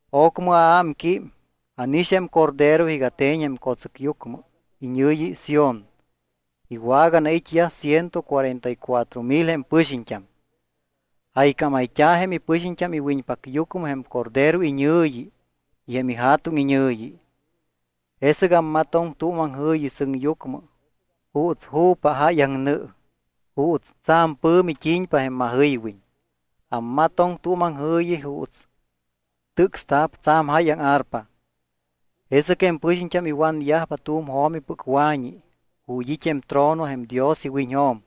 Ocmɨ aámquím, ánix jém Cordero iga te̱ñ jém co̱tsɨcyucmɨ iñɨ̱yi Sión. Iwaganait́yaj ciento cuarenta y cuatro mil jém ipɨxiñt́am. Jaycámayt́a̱ jém ipɨxiñt́am iwiñpacyucmɨ jém Cordero iñɨ̱yi y jém iJa̱tuŋ iñɨ̱yi. Jesɨc ammatoŋ tu̱m aŋjɨ̱yi sɨŋyucmɨ juuts ju̱pa jáyaŋ nɨ, juuts tsa̱m pɨ̱mi t́i̱ñpa jém majɨywiñ. Ammatoŋ tu̱m aŋjɨ̱yi juuts tɨcsta̱p tsa̱m jáyaŋ arpa. Jesɨc jém pɨxiñt́am iwanyajpa tu̱m jo̱mipɨc wa̱ñi ju̱t́ it́ jém trono jém Dios iwiñjo̱m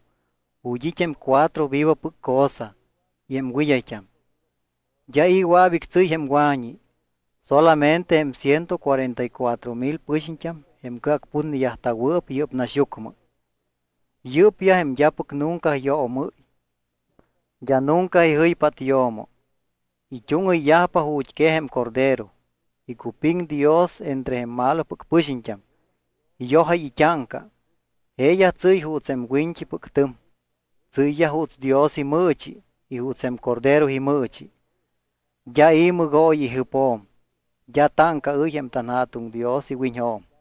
ju̱t́ it́ jém cuatro vivopɨc cosa y jém wɨd́ayt́am. D́a i̱ wɨa̱p ictsɨ́y jém wa̱ñi, solamente jém ciento cuarenta y cuatro mil pɨxiñt́am jém cɨacputneyajta̱wɨɨp yɨ́p naxyucmɨ. Yɨ́pyaj jém d́apɨc nunca yoomɨ́y, d́a nunca ijɨypát yo̱mo. It́úŋɨyyajpa ju̱t́ quej jém Cordero. Icupiŋ Dios entre jém malopɨc pɨxiñt́am. Iyojáy it́áŋca. Jeeyaj tsɨ́y juuts jém wiñt́ipɨc tɨm. Tsɨ́yyaj juuts Dios imɨɨchi y juuts jém Cordero imɨɨchi. D́a i̱ mɨgooyi ijɨpjo̱m. D́a táŋcaɨ́y jém tanJa̱tuŋ Dios iwiñjo̱m.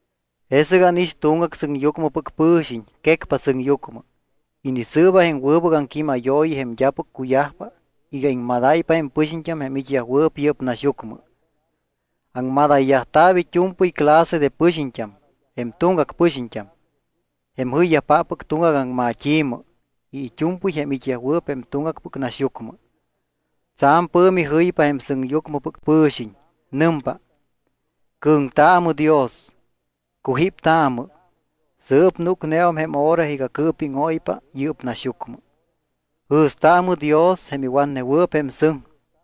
Jesɨc ánix tuŋgac sɨŋyucmɨpɨc pɨ̱xiñ quecpa sɨŋyucmɨ. Inisɨɨba jém wɨbɨc aŋquímayooyi jém d́apɨc cuyajpa iga iŋmadáypa jém pɨxiñt́am jém it́yajwɨɨp yɨ́p naxyucmɨ. Aŋmadayyajta̱p it́u̱mpɨy clase de pɨxiñt́am, jém tuŋgac pɨxiñt́am, jém jɨyyajpáppɨc tuŋgac aŋmat́i̱mɨ y it́u̱mpɨy jém it́yajwɨɨp jém tuŋgacpɨc naxyucmɨ. Tsa̱m pɨ̱mi jɨypa jém sɨŋyucmɨpɨc pɨ̱xiñ. Nɨmpa: —Cɨ̱ŋtaamɨ Dios, cujíptaamɨ. Sɨɨp núcneum jém hora iga cɨɨpíŋóypa yɨ́p naxyucmɨ. Jɨ̱staamɨ Dios jém iwatnewɨɨp jém sɨŋ,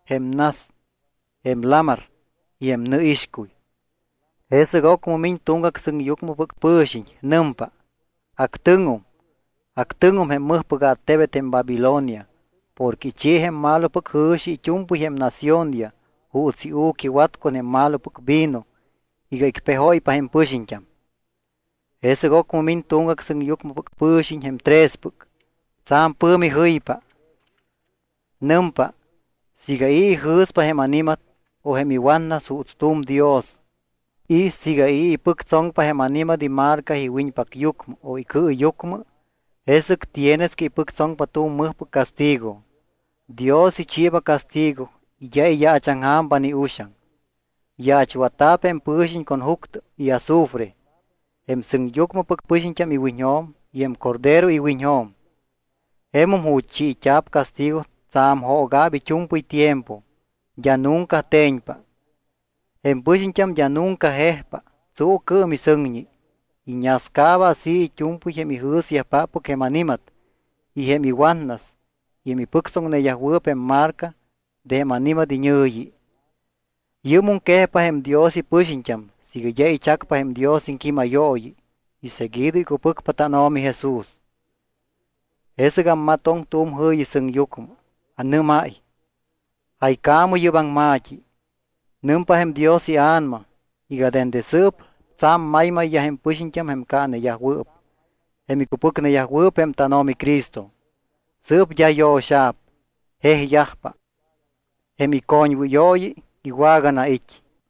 jém nas, jém lamar y jém nɨixcuy. Jesɨc ocmɨ miñ tuŋgac sɨŋyucmɨpɨc pɨ̱xiñ. Nɨmpa: —Actɨŋum, actɨŋum jém mɨjpɨc attebet jém Babilonia porque ichi jém malopɨc jɨ̱xi it́u̱mpɨy jém naciónyaj juuts iu̱quiwat con jém malopɨc vino iga icpejóypa jém pɨxiñt́am. Jesɨc ocmɨ miñ tuŋgac sɨŋyucmɨpɨc pɨ̱xiñ jém trespɨc. Tsa̱m pɨ̱mi jɨypa. Nɨmpa: —Siiga i̱ ijɨ̱spa jém ani̱mat o jém iwatnas juuts tu̱m dios y siiga i̱ ipɨctsoŋpa jém ani̱mat imarca iwiñpacyucmɨ o icɨɨyucmɨ, jesɨc tienes que ipɨctsoŋpa tu̱m mɨjpɨc castigo. Dios ichiiba castigo y d́a iyaachaŋja̱mpa ni uxaŋ. Yaachwatta̱p jém pɨ̱xiñ con juctɨ y azufre jém sɨŋyucmɨpɨc pɨxiñt́am iwiñjo̱m y jém Cordero iwiñjo̱m. Jemum ju̱t́ chiit́a̱p castigo tsa̱m jooga̱p it́u̱mpɨy tiempo, d́a nunca te̱ñpa. Jém pɨxiñt́am d́a nunca jejpa tsuucɨɨm ni sɨŋñi. Iñascaaba así it́u̱mpɨy jém ijɨ̱syajpáppɨc jém ani̱mat y jém iwatnas y jém ipɨctsoŋneyajwɨɨp jém marca de jém ani̱mat iñɨ̱yi. Yɨ́mum quejpa jém Dios ipɨxiñt́am siiga d́a ichacpa jém Dios iŋquímayooyi y seguido icupɨcpa tánO̱mi Jesús. Jesɨc ammatoŋ tu̱m jɨ̱yi sɨŋyucmɨ. Anɨ́máy: —Jaycaamɨ yɨ́p aŋma̱t́i: Nɨmpa jém Dios iA̱nama iga dende sɨɨp tsa̱m maymayyaj jém pɨxiñt́am jém caaneyajwɨɨp, jém icupɨcnewɨɨp jém tánO̱mi Cristo. Sɨɨp d́a yo̱xa̱p, jejyajpa. Jém icoñwɨyooyi iwaganait́.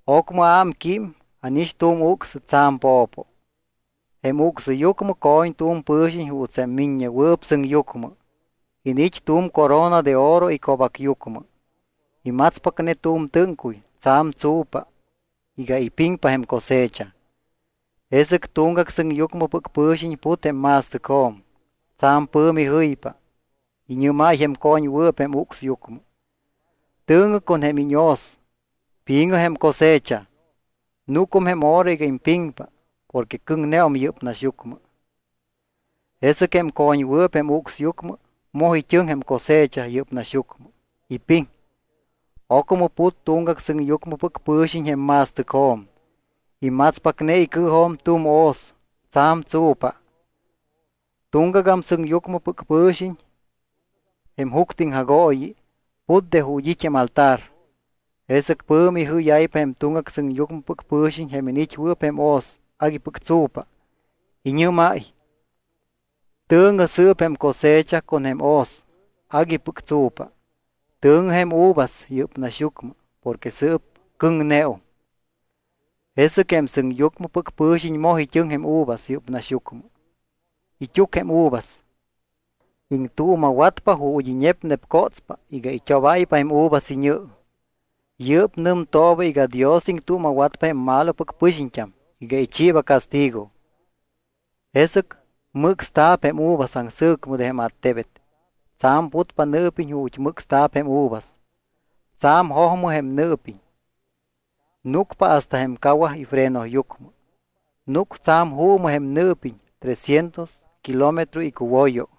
Ocmɨ aámquím y ánix tu̱m ucsɨ tsa̱m po̱po. Jém ucsyucmɨ co̱ñ tu̱m pɨ̱xiñ juuts jém Miññewɨɨp Sɨŋyucmɨ. Iniit́ tu̱m corona de oro ico̱bacyucmɨ. Imatspacne tu̱m tɨ́ŋcuy tsa̱m tsu̱pa iga ipiŋpa jém cosecha. Jesɨc tuŋgac sɨŋyucmɨpɨc pɨ̱xiñ put jém ma̱stɨcjo̱m. Tsa̱m pɨ̱mi jɨypa. Iñɨ́máy jém co̱ñwɨɨp jém ucsyucmɨ: —Tɨ̱ŋɨ con jém iñhoz, pi̱ŋɨ jém cosecha. Núcum jém hora iga impiŋpa porque cɨŋneum yɨ́p naxyucmɨ. Jesɨc jém co̱ñwɨɨp jém ucsyucmɨ moj it́ɨŋ jém cosecha yɨ́p naxyucmɨ, ipiŋ. Ocmɨ put tuŋgac sɨŋyucmɨpɨc pɨ̱xiñ jém ma̱stɨcjo̱m. Imatspacne icɨɨjo̱m tu̱m hoz tsa̱m tsu̱pa. Tuŋgagam sɨŋyucmɨpɨc pɨ̱xiñ, jém juctɨ iŋjagooyi, put de ju̱t́ it́ jém altar. Jesɨc pɨ̱mi ijɨ́yáypa jém tuŋgac sɨŋyucmɨpɨc pɨ̱xiñ jém iniit́wɨɨp jém hoz aguipɨc tsu̱pa. Iñɨ́máy: —Tɨ̱ŋɨ sɨɨp jém cosecha con jém hoz aguipɨc tsu̱pa. Tɨ̱ŋɨ jém uvas yɨ́p naxyucmɨ porque sɨɨp cɨ̱ŋneum. Jesɨc jém sɨŋyucmɨpɨc pɨ̱xiñ moj it́ɨŋ jém uvas yɨ́p naxyucmɨ. It́úc jém uvas, iŋtuuma̱watpa ju̱t́ iñepnepcotspa iga it́obáypa jém uvas iñɨ. Yɨ́p nɨmtooba iga Dios iŋtuuma̱watpa jém malopɨc pɨxiñt́am iga ichiiba castigo. Jesɨc mɨcsta̱p jém uvas aŋsɨ̱cmɨ de jém attebet. Tsa̱m putpa nɨɨpiñ ju̱t́ mɨcsta̱p jém uvas. Tsa̱m jojmɨ jém nɨɨpiñ, núcpa hasta jém cawaj ifrenoyucmɨ. Núc tsa̱m juumɨ jém nɨɨpiñ trescientos kilómetro icuwoyo.